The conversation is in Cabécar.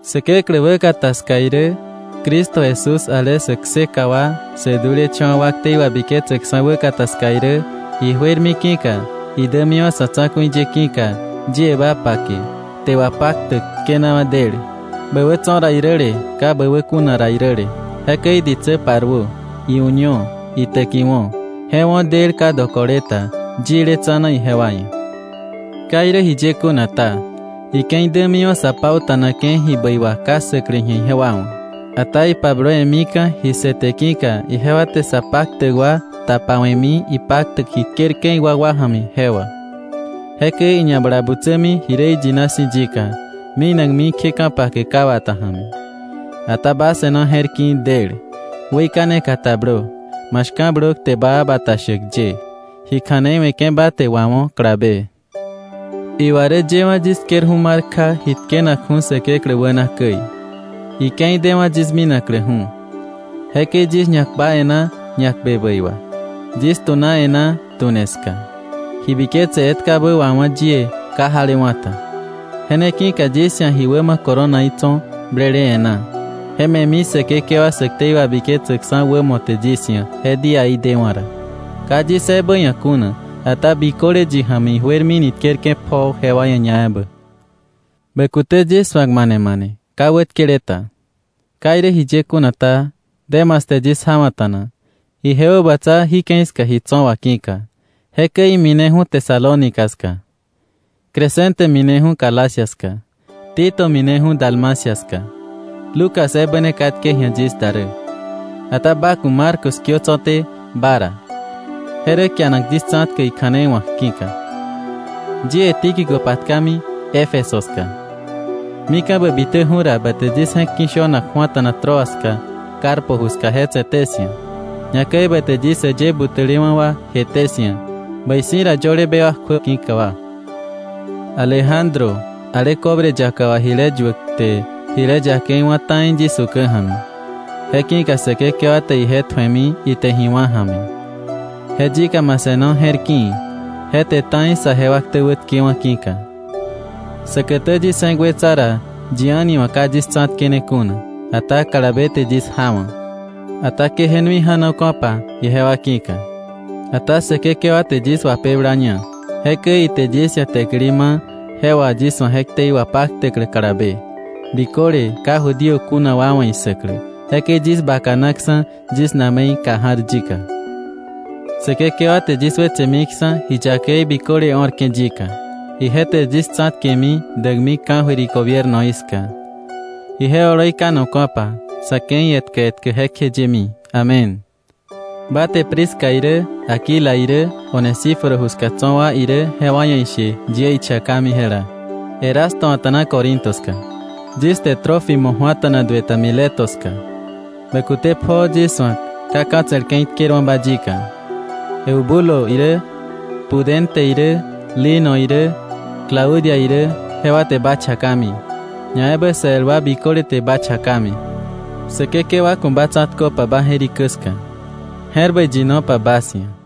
Säkeklä wäkata ska irä Cristo Jesús ale sä kseka wa irä sä dulecha̱wa̱ wa irä ktei wabiketsäkksa̱ wäkata ska irä, ijuermi ki̱ka, idämiwa̱ sa̱ tsa̱ku̱i ye ki̱ka, yie ba pake kte wapaktäk tkenawa̱ del, bä wä tso̱ ra iräle ka bä wä kuna ra iräle. Jekäi ditsä paruö, iuño, itäkiwo̱; je wo̱ del ka dokole ta yile tsa̱na ijewa ia̱. Ka irä jiye kuna ta, ike̱i dämiwa̱ sa pauta̱nake̱ ji bäi wà ka ssäklä ji̱a ijewa wa̱. Ata ipablowe̱mika̱ ji ssëte ki̱ka ijewa te sa paktäk wa tapawe̱mi ipaktäk ji tkerke̱ iwakwa ja̱mi je wà. Jekäi iñabalabutsämi ji rä iyina si̱ yika, minakmi kje ka̱pake ka wata ja̱mi. Ata ba se̱no je̱r ki̱i̱ del, weikane katablö, ma shka̱blö kte baa bata shäk ye. Ji kja̱nei we̱ke̱ ba te wawo̱ kalabe. Iwa rä yëwa̱ yis tkerju̱ mar kja ji tkenakju̱ Säkeklä wäna käi, ike̱i dewa̱ yis minakläju̱. Jekäi yis ñakpa e̱ná ñakpe bäi wa. Yis tu̱na e̱ná tu̱ne ska. Ji biketse etkabä wawá̱ yie ka jalewa̱ ta. Je ne ki̱ka yis ia̱ ji wämo coronaí tso̱ blele e̱ná. Je me̱mi Säkekewa sä ktei wabiketsäkksa̱ wämo te yis ia̱ je díaí dewa̱ ra; ka yis ebä ia̱ kuna, ata biköle yi ja̱mi ijuermini tkerke̱ pjoo jewa ia̱ ñaebä. Bä kute yis su̱ak mane mane ka wätkele ta. Ka irä jiye kuna ta, Demas te yis jawa̱ta̱na, ije wäbatsa jí ke̱i ska ji tso̱ wà ki̱ka. Jekäi imineju̱ Tesalónica ska; Crescente mineju̱ Galacia ska; Tito mineju̱ Dalmacia ska. Lucas ebä ne katke ji̱a yis da rä. Ata ba ku̱ Marcos kiö tso̱té ba ra, je rä kianak yis tsa̱tkäk ikja̱nei wa̱k ki̱ka. Yie Tíquico patkami Éfeso ska. Mika̱ bä bitäju̱ ra, ba te yis je̱k ki̱ shönak ju̱ata̱na Troas ska, Carpo ju ska je tse̱té 'sia̱. Ñakäi ba te yis äyë butäle wa jeté 'sia̱, bäi si̱ ra yöle bewak kjuä ki̱ka wa. Alejandro, ale cobre yaka wà jile yuäk, te jile yakei wá̱ ta̱i yis ukä ja̱mi. Je ki̱ka Säkekewa te ije tju̱emi ite ji wá̱ ja̱mi. Je yika ma se̱no je̱r ki̱i̱, je te ta̱i saje wa ktä wätkewa̱ ki̱ka. Säkätä yis je̱k wetsa ra, yi a̱ni wa̱ ka yis tsa̱tkene kuna; ata kalabe te yis jawa̱. Ata ke je nui ja̱noka̱pa ijewa ki̱ka. Ata Säkekewa te yis wapeblaña. Jekäi ite yis ia̱ täkili ma̱ je wà yis wa̱ je ktei wapaktäklä kalabe, biköle ka Judío kuna wa wa̱ issäklä. Jekäi yis bakanaksa̱ yis na̱me̱i kà ja̱r yika. Säkekewa te yis wetsemiksa̱ ji yakei biköle o̱rke̱ yika; ije te yis tsa̱tkemi däkmi ka̱jöir igobiernoí ska. Ije oloi kanoka̱pa sa̱ ke̱i etkä etkä jekjeyemi. Amén. Ba te Prisca irä Aquila irä Onesíforo ju ska tso̱ wa irä jewa ia̱ ishe yie ichakami jela. Erasto a̱ta̱na Corinto ska; yis te Trófimo ju̱ata̱na duë ta Mileto ska. Bä kute pjoo yis su̱ak ka ka̱tse̱l ke̱i tkerwa̱ba yika. Eubulo irä, Pudente irä, Lino irä, Claudia irä, jewa te ba chakami, ñaebä sa el wa biköle te ba chakami. Säkekewa ku̱ ba tsa̱tköpa ba je̱rikä ska. Je̱r bäi yinopa bas ia̱.